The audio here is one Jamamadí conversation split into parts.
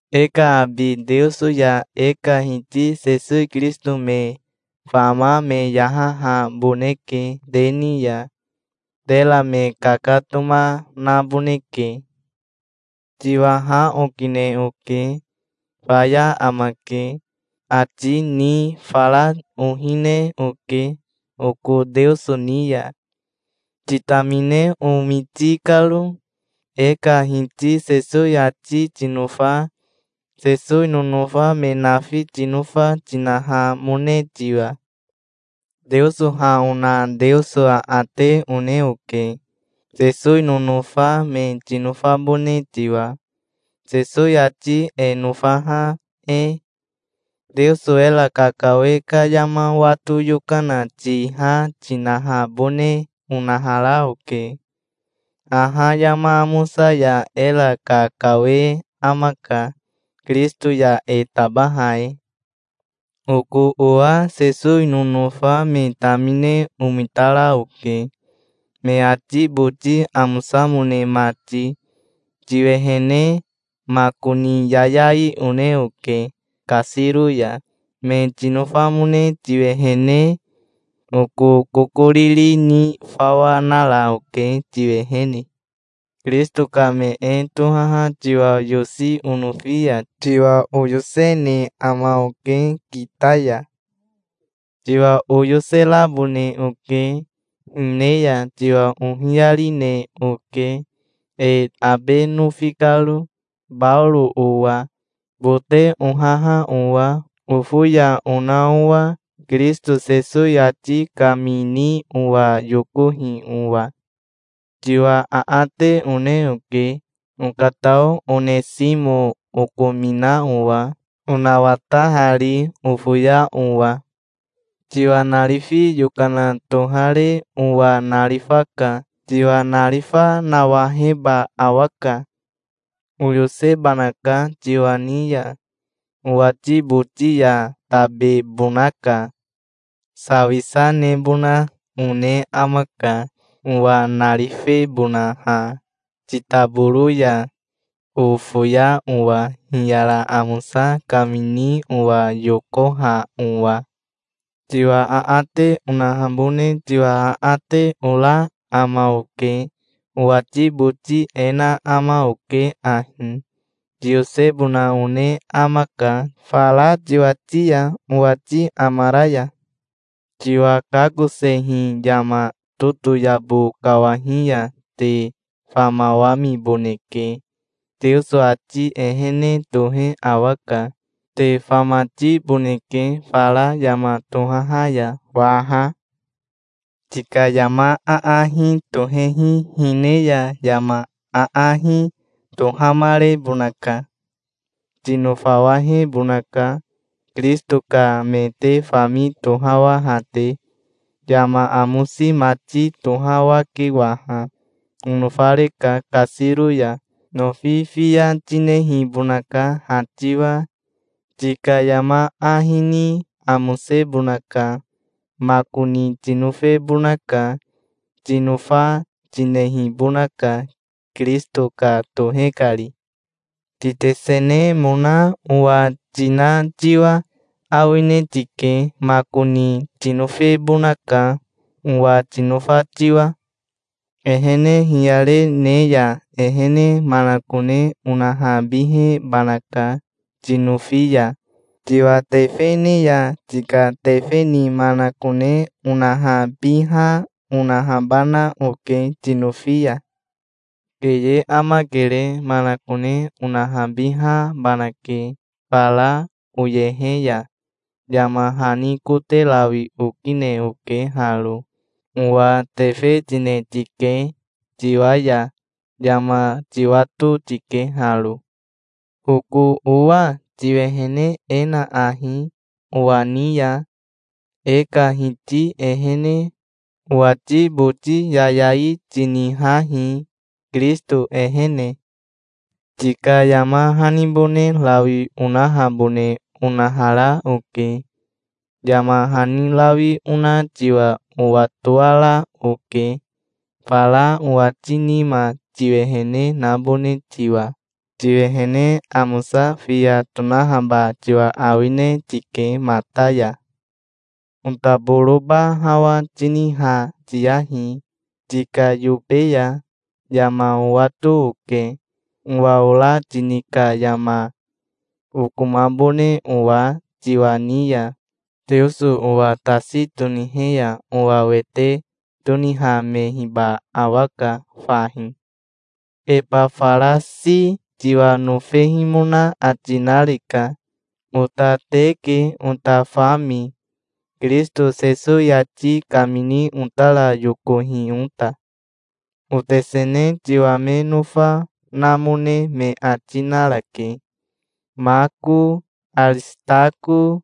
E ka abi Teoso ya e ka Hiti Sesowi Kirisito me fama me yahahaboneke te ni ya. Tera me kakatoma naboneke. Tiwa ha okine oke. "Faya amake", ati ni fara ohine oke oko Teoso ni ya, titamine omiti karo, e ka Hiti Sesowi ati tinofa, Sesowi nonofa me nafi tinofa, tinahamone tiwa. Teoso ha ona Teoso aate one oke, Sesowi nonofa me tinofabone tiwa, Sesowi ati e nofaha e. Teoso era kakawe ka yama wato yokana tiha tinahabone onahara oke. Haha yama amosa ya era kakawe amaka, Kirisito ya e tabaha e. Oko owa Sesowi nonofa me tamine omitara oke, me ati boti amosamone mati, tiwehene. Makoni yayai one oke kasiro ya, me tinofamone tiwehene. Oko kokoriri ni fawa nara oke tiwehene. Kirisito ka me e tohaha tiwa yosi onofi ya tiwa oyosene ama oke kita ya. Tiwa oyoserabone oke. Hine ya tiwa ohiyarine oke, e abe nofi karo, Baoro owa, bote ohaha owa, ofoya ona owa Kirisito Sesowi ati kamini owa yokohi owa. Tiwa aate one oke, okatao Onesimo okomina owa, onawatahari, ofoya owa. Tiwa narifi yokana tohare owa narifaka. Tiwa narifa nawaheba awaka. Oyosebanaka tiwa ni ya. Owati boti ya tabebonaka. Sawisa nebona one amaka, owa narifebonaha titaboro ya, ofoya owa hiyara amosa kamini owa yokoha owa. Tiwa aate onahabone tiwa aate ora ama oke. Owati boti e na ama oke ahi: tiyosebona one amaka fara tiwati ya, owati amara ya. Tiwa kakosehi yama totoyabo kawahi ya te famawamiboneke. Teoso ati ehene tohe awaka. Te famatiboneke fara yama tohaha ya waha. Tika yama aahi tohehi hine ya yama aahi tohamarebonaka. Tinofawahebonaka, Kirisito ka me te fami tohawaha te. Yama amosi mati tohawake waha. Onofareka kasiro ya. Nofi fiya tinehibonaka ha tiwa. Tika yama ahi ni amosebonaka. Makoni tinofebonaka. Tinofa, tinehibonaka, Kirisito ka tohe kari. Titesenemona owa tina tiwa awine tike. Makoni tinofebonaka, owa tinofa tiwa. Ehene hiyare ne ya ehene manakone onahabihebanaka, tinofi ya. Tiwa tefe ne ya tika tefe ni manakone onahabiha, onahabana oke tinofi ya. Keye amakere. Manakone onahabihabanake. Fara oyehe ya yama hani kote rawi okine oke haro. Owa tefe tine tike, tiwa ya. Yama tiwato tike haro. Oko owa tiwehene e na ahi owa ni ya, e ka Hiti ehene. Owati boti yayai tinihahi, Kirisito ehene. Tika yama hanibone rawi onahabone onahara oke. Yama hani rawi ona tiwa owatoara oke, fara owati nima tiwehene nabone tiwa. Tiwehene amosa fiya tonahaba tiwa awine tike mata ya. Otaboroba hawa tiniha tiyahi tika yobe ya. Yama owato oke, owa ora tini ka yama, okomabone owa tiwa ni ya. Teoso owa tasi tonihe ya owa wete tonihamehiba awaka fahi. Ebafarasi tiwa nofehimona ati nareka. Ota te ke ota fami, Kirisito Sesowi ati kamini otara yokohi ota. Otesene tiwa me nofa, namone me ati narake, Mako, Arisitako,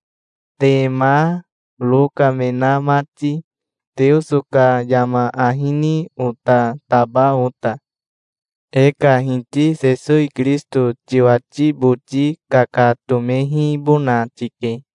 Tema, Roka, me na mati, Teoso ka yama ahi ni ota taba ota. E ka Hiti Sesowi Kirisito tiwati boti kakatomehibona tike.